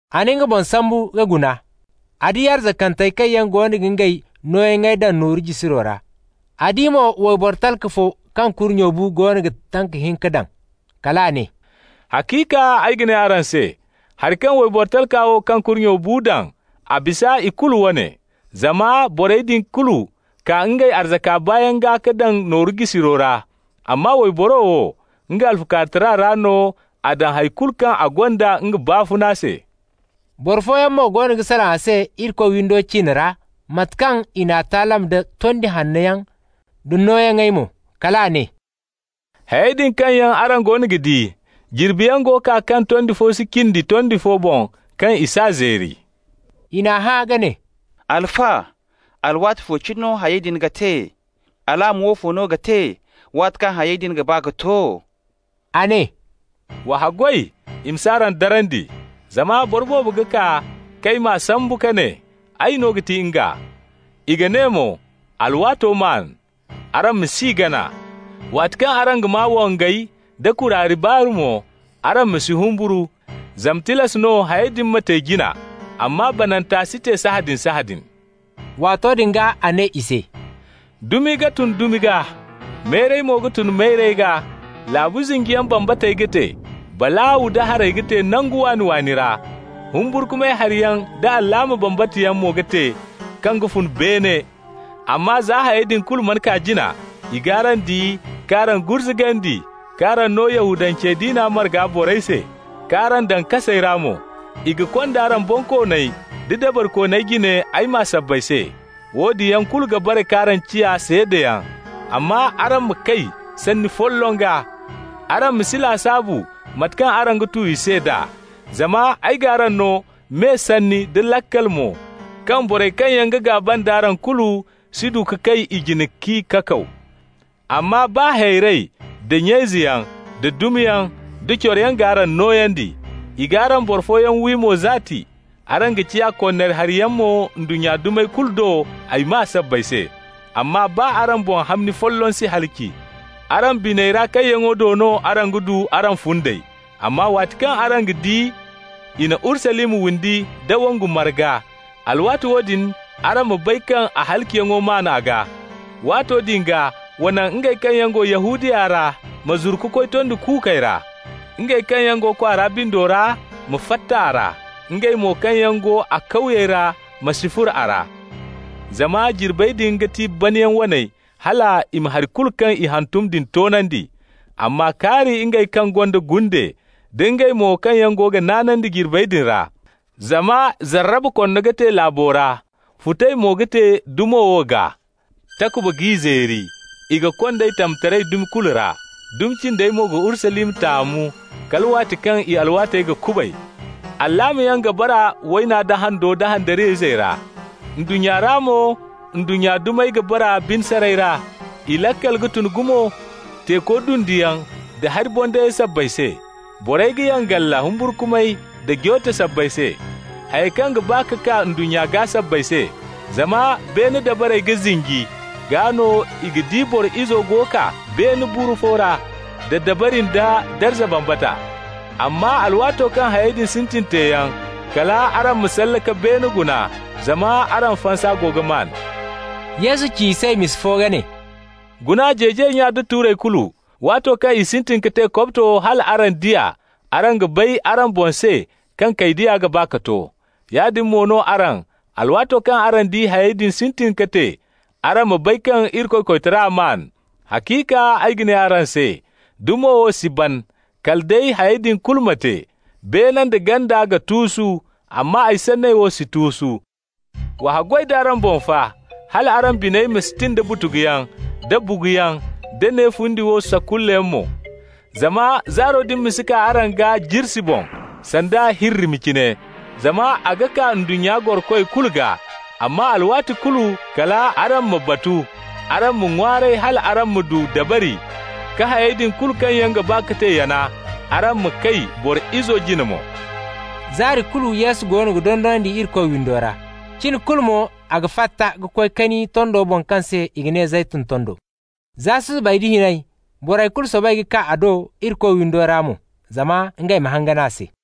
A na nga boŋ sambu ka guna. A di arzakantey kaŋ goono ga ngey nooyaŋey daŋ nooru jisiro ra. A di mo wayboro talka fo kaŋ kurnye bu goono ga tanka hinka daŋ. Kal a ne: «Haciika ay ga ne araŋ se: hari kaŋ wayboro talka wo kaŋ kurnye bu daŋ, a bisa i kulu wane. Zama borey din kulu kaa ngey arzaka baayaŋ gaa ka daŋ nooyaŋey jisiro ra. Amma wayboro wo, nga alfukaarutara ra no a daŋ hay kulu kaŋ a gonda nga baafuna se.» Boro fooyaŋ mo goono ga salaŋ a se Irikoy windo ciine ra, mate kaŋ i n'a taalam da tondi hanno yaŋ da nooyaŋey mo. Kal a ne: «Hayey din kaŋ yaŋ araŋ goono ga di, jirbiyaŋ go kaa kaŋ tondi fo si cindi tondi fo boŋ, kaŋ i s'a zeeri.» I n'a hã ka ne: «Alfa, alwaati fo cine no hayey din ga te? Alaama woofo no ga te waati kaŋ hayey din ga ba ka to?» A ne: «Wa haggoy i ma s'araŋ darandi. Zama boro boobo ga kaa k'ay maa sambu ka ne: ‹Ay no ga ti nga›. I ga ne mo: ‹Alwaato maan›. Araŋ ma s'i gana. Waati kaŋ araŋ ga maa wongey da kuraari baaru mo, araŋ ma si humburu, zama tilas no hayey din ma te jina. Amma bananta si te sahãadin-sahãadin.» Waato din gaa a ne i se: «Dumi ga tun dumi gaa, mayray mo ga tun mayray gaa. Laabu zinjiyaŋ bambatey ga te, balaaw da haray ga te nangu waani-waani ra. Humburkumay hari yaŋ da alaama bambata yaŋ mo ga te kaŋ ga fun beene. Amma za hayey din kulu mana kaa jina, i g'araŋ di k'araŋ gurzugandi, k'araŋ no Yahudance diina marga borey se, k'araŋ daŋ kasey ra mo. I ga kond'araŋ bonkooney da dabarikooney jine ay maa sabbay se. Woodin yaŋ kulu ga bare k'araŋ ciya seedayaŋ. Amma araŋ ma kay sanni folloŋ gaa: araŋ ma si lasaabu mate kaŋ araŋ ga tu i se d'a. Zama ay g'araŋ no me sanni da laakal mo kaŋ borey kaŋ yaŋ ga gaaba nd'araŋ kulu si du ka kay i jine k'i kakaw. Amma baa hayrey, da nya-izeyaŋ, da dumiyaŋ, da coroyaŋ g'araŋ nooyandi. I g'araŋ boro fooyaŋ wi mo zaati. Araŋ ga ciya konnari hari yaŋ mo ndunnya dumey kulu do ay maa sabbay se. Amma baa araŋ boŋ hamni folloŋ si halaci. Araŋ biney ra kayyaŋo do no araŋ ga du araŋ fundey. Amma waati kaŋ araŋ ga di i na Urusalima windi nda wongu marga, alwaati woodin araŋ ma bay kaŋ a halaciyaŋo maan a gaa. Waato din gaa wa naŋ ngey kaŋ yaŋ go Yahudiya ra ma zuru ka koy tondi kuukey ra. Ngey kaŋ yaŋ go kwaara bindo ra ma fatta a ra. Ngey mo kaŋ yaŋ go a kawyey ra ma si furo a ra. Zama jirbey din ga ti banayaŋ waney hal i ma hari kulu kaŋ i hantum din toonandi. Amma kaari ngey kaŋ gonda gunde, da ngey mo kaŋ yaŋ go ga naanandi jirbey din ra! Zama zarraba korno ga te laabo ra, futay mo ga te dumo wo gaa. Takuba g'i zeeri, i ga kond'ey tamtaray dumi kulu ra. Dumi cindey mo ga Urusalima taamu kala waati kaŋ i alwaatey ga kubay. Alaamayaŋ ga bara wayna da hando da handariyayzey ra. Ndunnya ra mo, ndunnya dumey ga bara bine saray ra. I laakal ga tun gumo teeko dunduyaŋ da hari bondayey sabbay se. Borey ga yangala humburkumay da joote sabbay se, hayey kaŋ ga ba ka kaa ndunnya gaa sabbay se, zama beene dabarey ga zinji. Gaa no i ga di Boro Izo go ga kaa beene buru fo ra da dabari nda darza bambata. Amma alwaato kaŋ hayey din sintin teeyaŋ, kal araŋ ma salle ka beene guna, zama araŋ fansa go ga maan.» Yesu ci i se misa fo ka ne: «Guna jeejay nya nda tuurey kulu. Waato kaŋ i sintin ka te kobto hal araŋ di a, araŋ ga bay araŋ boŋ se kaŋ kaydiya ga ba ka to. Yaadin mo no araŋ, alwaato kaŋ araŋ di hayey din sintin ka te, araŋ ma bay kaŋ Irikoy koytara maan. Haciika ay ga ne araŋ se: dumo wo si ban, kala day hayey din kulu ma te. Beene nda ganda ga tuusu, amma ay sanney wo si tuusu. Wa haggoy d'araŋ boŋ fa, hal araŋ biney ma si tin da butuguyaŋ, da buguyaŋ, da ne fundi wo sakullayaŋ mo, zama zaaro din ma si kaa araŋ gaa jirsi boŋ, sanda hirrimi cine. Zama a ga kaa ndunnya gorokoy kulu gaa. Amma alwaati kulu, kal araŋ ma batu, araŋ ma ŋwaaray hal araŋ ma du dabari ka hayey din kulu kaŋ yaŋ ga ba ka te yana, araŋ ma kay Boro Izo jine mo.» Zaari kulu Yesu go ga dondonandi Irikoy windo ra. Cin kulu mo a ga fatta ka koy kani tondo boŋ kaŋ se i ga ne Zeytun tondo. Za susubay nda hinay, borey kulu soobay ka kaa a do Irikoy windo ra mo, zama ngey ma hangan a se.